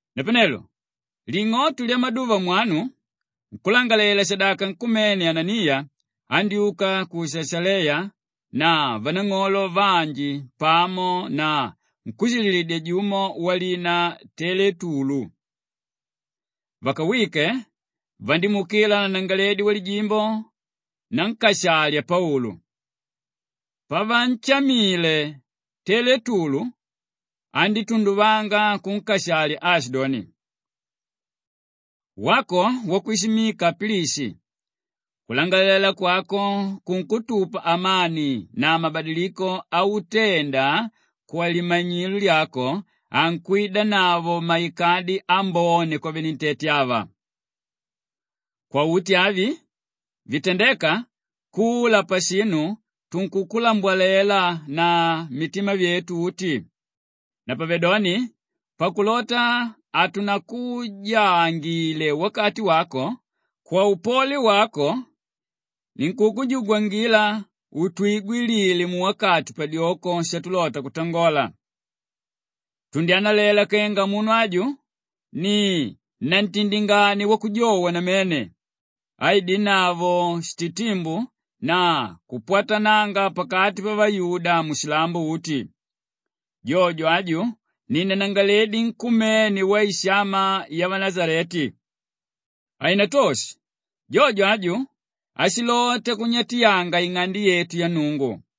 Napanelo ling'oto lyamaduva mwanu nkúlangalalela-shadaka nkumene Ananiya andyúka ku Shashaleya na vanang'olo vanji pamo na nkúshililidya jumo walina Teletulu. Vakawike, vandímuukila nanangalaledi wamajimbo nankashalya Paulu. Pavanshamile, Teletulu andítunduvanga kunkashalya aashidoni, “Wako wakwishimika Pilishi, kulangalalela kwako kunkutupa amani na mabadiliko autenda kwalimanyilo lyako ankwidanavo maikadi ambone kwavenentete ava. Kwauti vinu vitandéka, kula pashinu tunkukulambwalela na mitima vyetu uti. Napavedoni pakulota hatunakujaangile wakati wako, kwaupole wako ninkukujugwangila utwigwilile muwakati padyoko shatulota kutangola. Tundyanalela kenga munu aju ni nantindingania wakujowa namene áidanavo shititimbu na kupwatananga pakati pavayuda mushilambo uti. Jojo aju ni nanangalaledi nkumene waishama yavanashaleti. Hainatoshe jojo aju ashilota kunyatyanga ing'ande yetu ya Nnungu.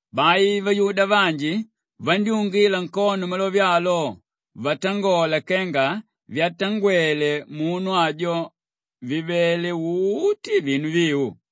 Bai vayuda vanji vandyúngila nkono malove alo vatangola kenga vyatangwele munu ajo vivele uti vinu viu.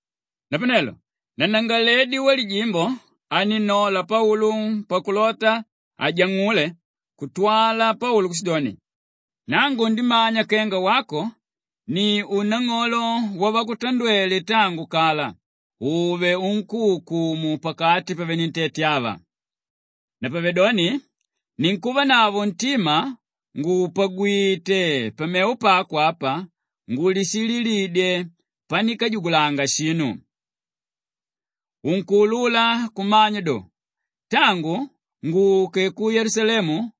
Napanelo nanangalaledi wamajimbo anínnola Paulu pakulota ajang'ule kutwala Paulu kushidoni, “Nangu ndimanya kenga wako ni unang'olo wavakutandwele tangu kala ùve unkúukumu pakati pavenentete ava. Napavedoni ninkuvanavo ntima ngùpagwite pamevo pako apa ngulishililidye panikajugulanga shinu. Unkuulula kumanya do, tangu nguke ku Yelusalemu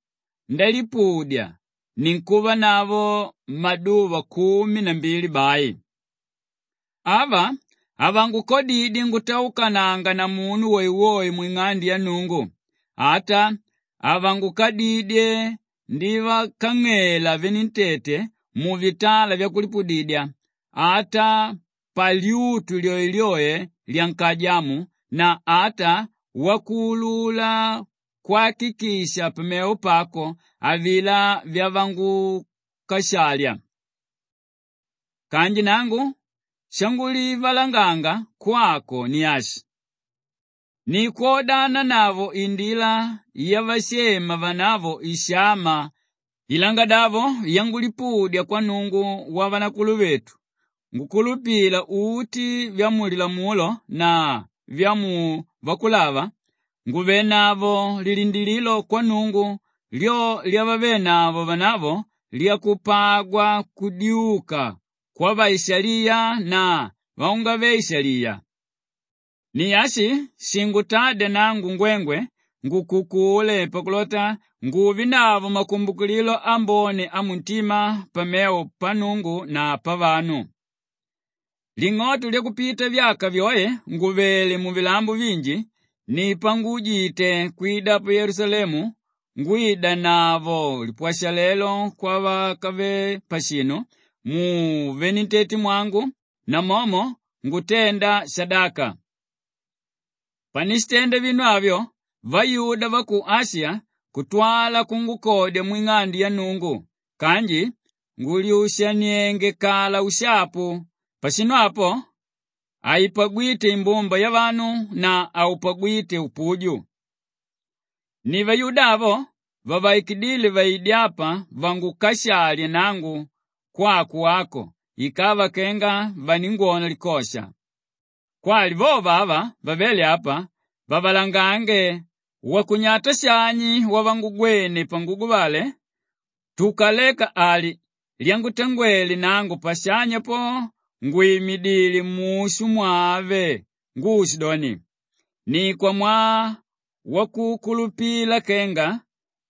ndalipudya ninkuvanavo maduva kumi na mbili bai. Ava havangukadidye ngutaukananga na munu woewoe mwing'ande ya Nnungu, ata havangukadidye ndivakang'ela venentete muvitala vyakulipudidya ata palyutu lyoelyoe lyankaja amo na ata wakuulula kwakikisha pamevo pako avilá vyavangukashalya. Kanji nangu shangulivalanganga kwako ni ashi: ni kwodananavo Indila yavashema vanavo ishama ilangadavo yangulipudya kwa Nnungu wavanakuluvetu ngukulupila uti vya mu Lilamulo na vya mu Vakulava nguvanavo lilindilililo kwa Nnungu, lyo lyavavenavo vanavo lyakupagwa kudyuka kwavaishaliya na vaungave-ishaliya. Ni ashi shingutádya nangu ngwengwe ngukukule pakulota nguvenavo makumbukililo ambone amuntima pamevo pa Nnungu na pavanu. “Ling'oto lyakupita vyaka vyoe ngùvele muvilambo vinji, ni panguujite kwida pa Yelusalemu ngwidanavo lipwashalelo kwavakave pashinu muvenentetemwangu namomo ngutenda shadaka. Panishitenda vinu avyo, vayuda va ku Ashiya kutwala kungukodya mwing'ande ya Nnungu kanji ngùlyushanienge kala ushapu; pashinu apo haipagwíte imbumba yavanu na haupagwíte upuju. Ni vayuda avo vavaikidíle vaide apa vangukashalye nangu kwako wako ikava kenga vaningwona likosha. Kwali vovo ava vavéle apa, vavalangange wakunyata shani wavangugwene panguguvale tukaleka ali lyangutangwele nangu pashanya po ngwìmidile mushu mwave nguushidoni, ‘Ni kwamwaa wakukulupila kenga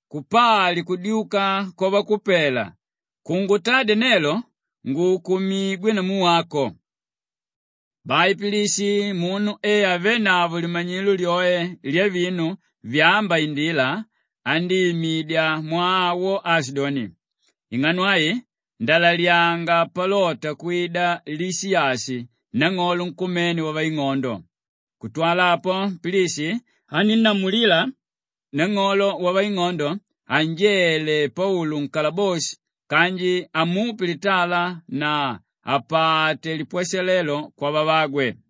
kupali kudyuka kwavakupela kungutadya nelo nguukumigwe namu wako.’” Bai Pilishi, munu e avénavo limanyilo lyoe lyavinu vyámba Indila, andíimidya mwaa awo aashidoni, “Ing'ano ai ndalalyanga palota kwida Lishiyashi nang'olo nkumene wavaing'ondo.” Kutwala apo, Pilishi anínnamulila nang'olo wavaing'ondo anjele Paulu nkalaboshi kanji amupe litala na apate lipwashalelo kwavavagwe.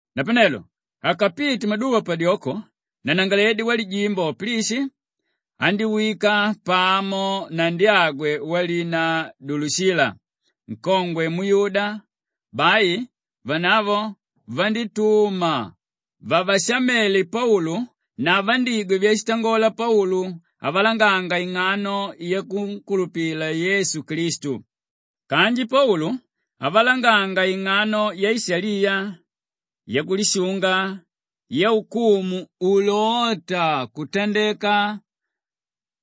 Napanelo akapite maduva padyoko, nanangalaledi wamajimbo Pilishi andíwika pamo na ndyagwe walina Dulushila, nkongwe muyuda; bai vanavo vandítuma vavashamele Paulu na vandígwa vyashitangola Paulu avalanganga ing'ano yakunkulupila Yesu Klistu. Kanji Paulu avalanganga ing'ano yaishaliya, yakulishunga, yaukumu ulóta kutandeka,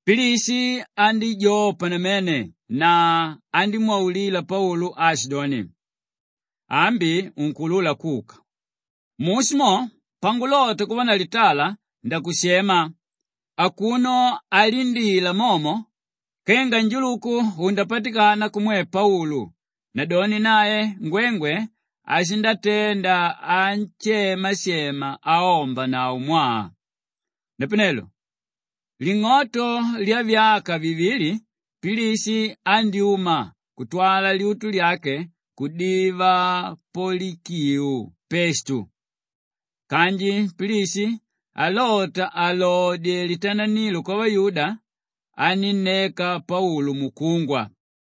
Pilishi andíjopa namene na andímwaulila Paulu aashidoni, “Ambi unkuulula kuka! Mushu mo pangulota kuva na litala ndakushema,” akuno alindila momo kenga njuluku undapatikananga kumwe Paulu, nadoni nae ngwengwe ashindatenda anshemashema aombanavo mwaa. Napanelo ling'oto lyavyaka vivili Pilishi andyúma kutwala lyutu lyake kudiva Polikiu Pestu. Kanji Pilishi alota alodye litananilo kwavayuda, anínneka Paulu mukungwa.